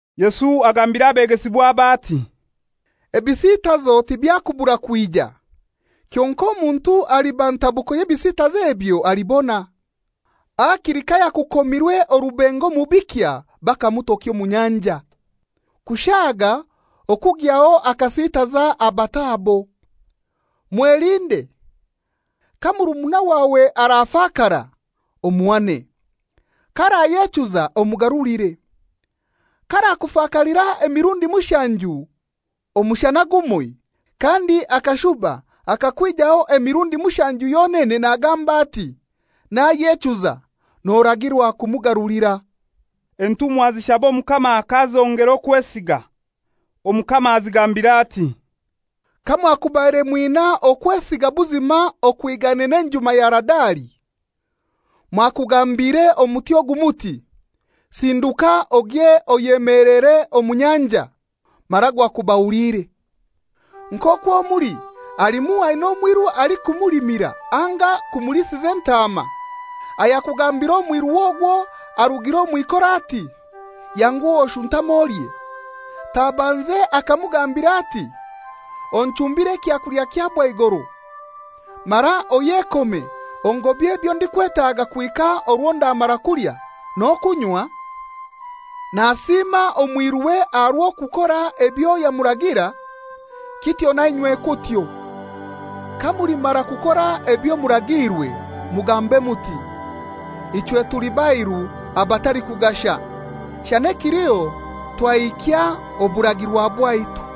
Yesu agambira abegesibwabe ati, «Ebisitazo tibyakubura kwija. Kyonkai omuntu aliba ntabuko y'ebisitazo ebyo alibona! Hakili kayakukomirwe orubengo omu bikya bakamutokya omu nyanja, kushaaga okugyaho akasitaza abato abo. Mwelinde. Ka murumuna wawe arafakara, omuhane. K'arayechuza omugarulire. K'arakufakalira emirundi mushanju omushana gumoi, kandi akashuba akakwijaho emirundi mushanju yonene nagamba ati, ‹Nayechuza,› noragirwa kumugarulira.» Entumwa zishaba Omukama k'azongera okwesiga. Omukama azigambira ati, «Kamwakubaire mwina okwesiga buzima okwigaine enjuma ya Haradali, mwakugambiire omuti ogu muti, ‹Sinduka ogye oyemelere omu nyanja,› mara gwakubahuliire. «Nk'okwo muli halimu aina omwiru alikumulimira anga kumuliisiza entaama, ayakugambira omwiruwe ogwo arugire omw'ikora ati, ‹Yanguha oshuntame olye?› Tabanze akamugambira ati, ‹Onchumbire ekyakulya kya bwaigoro, mara oyekome ongobye ebyo ndikwetaaga kuhika orwo ndamara kulya n'okunywa?› Nasiima omwiruwe aha rw'okukora ebyo yamuragira? Kityo nainywe kutyo. Kamulimara kukora ebyo muragiirwe, mugambe muti, ‹Ichwe tuli bairu abatalikugasha; shana ekiliho twahikya oburagirwa bwaitu.›»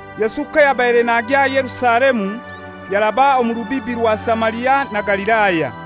Yesu kayabaire nagya Yerusalemu, yaraba omu rubibi rwa Samaria na Galilaya.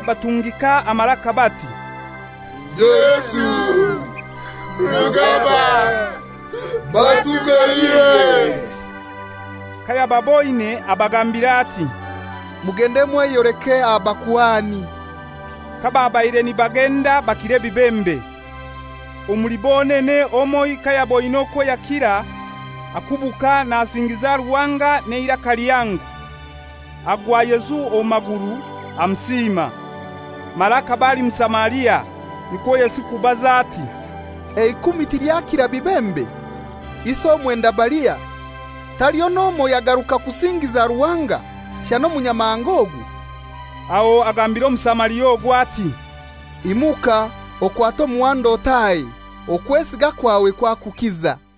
batungika amaraka bati, «Yesu, Rugaba, batuganyire.» Kayababoine abagambira ati, «Mugende mweyoleke abakuhani.» Kababaire nibagenda bakira ebibembe. Omuli bonene omoi kayaboine okwo yakira, akubuka nasingiza Ruhanga n'eiraka lihango. Agwa Yesu omu maguru, amusiima. Mara akaba ali Musamaria. Nikwo Yesu kubaza ati, «Eikumi tilyakira bibembe? Isi omwenda balihai? Taliho n'omoi yagaruka kusingiza Ruhanga shana omunyamahanga ogu?» Aho agambira Omusamaria ogwo ati, «Imuka okwate omuhanda otahe; okwesiga kwawe kwakukiza.»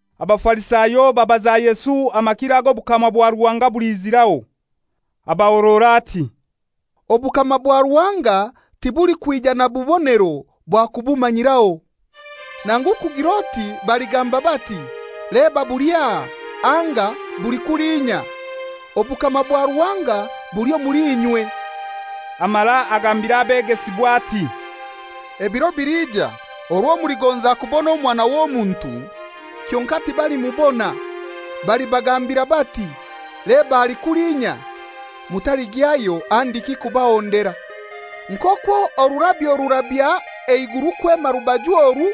Abafarisayo babaza Yesu amakiro ago obukama bwa Ruhanga buliiziraho. Abahorora ati, «Obukama bwa Ruhanga tibulikwija na bubonero bwa kubumanyiraho. Nangu kugir'oti baligamba bati, ‹Leba, buli aha!› Anga, ‹Buli kulinya!› Obukama bwa Ruhanga buli omuli inywe.» Amara agambira abegesibwa ati, «Ebiro biliija orwo muligonza kubona Omwana w'Omuntu, kyonkai timulimubona. Balibagambira bati, ‹Leba ali kulinya.› Mutaligyayo handiki kubahondera. Nk'okwo orurabyo rurabya eiguru kwema rubaju oru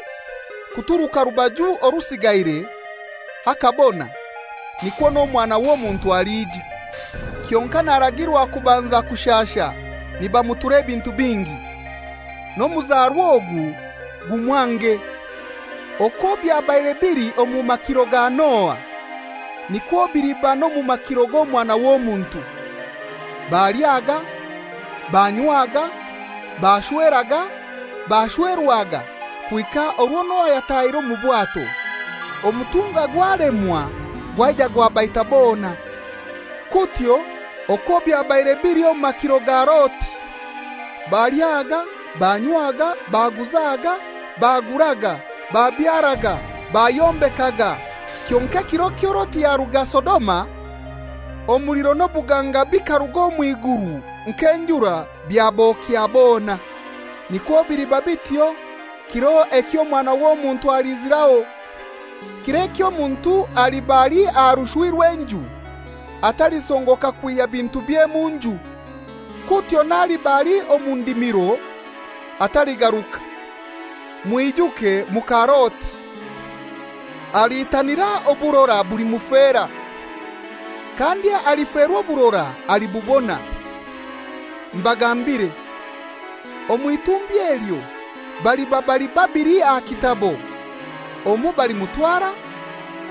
kuturuka rubaju orusigaire hakabona, nikwo n'Omwana w'Omuntu alija. Kyonkai naragirwa kubanza kushasha nibamutura ebintu bingi, n'omuzarwa ogu gumwange. Okwo byabaire bili omu makiro ga Noa, nikwo biliba n'omu makiro g'Omwana w'Omuntu. Balyaga, banywaga, bashweraga, bashwerwaga, kuhika orwo Noa yatahire omu bwato, omutunga gwalemwa gwaija gwabaita bona. Kutyo okwo byabaire bili omu makiro ga Loti, balyaga, banywaga, baguzaga, baguraga, babyaraga, bayombekaga, Kyonkai kiro ekyo Loti yaruga Sodoma, omuliro n'obuganga bikaruga omw'iguru nk'enjura byabokya bona. Nikwo biliba bityo kiro ekyo Omwana w'Omuntu aliiziraho. Kir'ekyo omuntu aliba ali aha rushwi rw'enju, atalisongoka kwihya bintubye mu nju. Kutyo n'aliba ali omu ndimiro ataligaruka. Mwijuke muka Loti! Aliitanira oburora bulimufera, kandi aliferwa oburora alibubona. Mbagambire, omw'itumbi elyo baliba bali babili aha kitabo: Omoi balimutwara,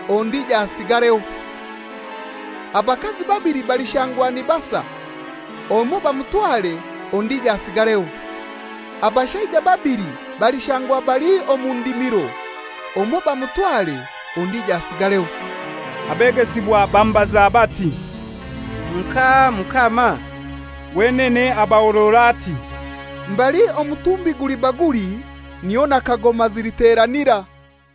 ondijo asigareho. Abakazi babili balishangwa nibasa: Omoi bamutware, ondijo asigareho. [ Abashaija babili balishangwa bali omu ndimiro: Omoi bamutware, ondijo asigareho.]» Abegesibwa bamubaza bati, «Nkahai, Mukama?» Wenene abahorora ati, «Mbali omutumbi guliba guli, niho na kagoma ziliteranira.»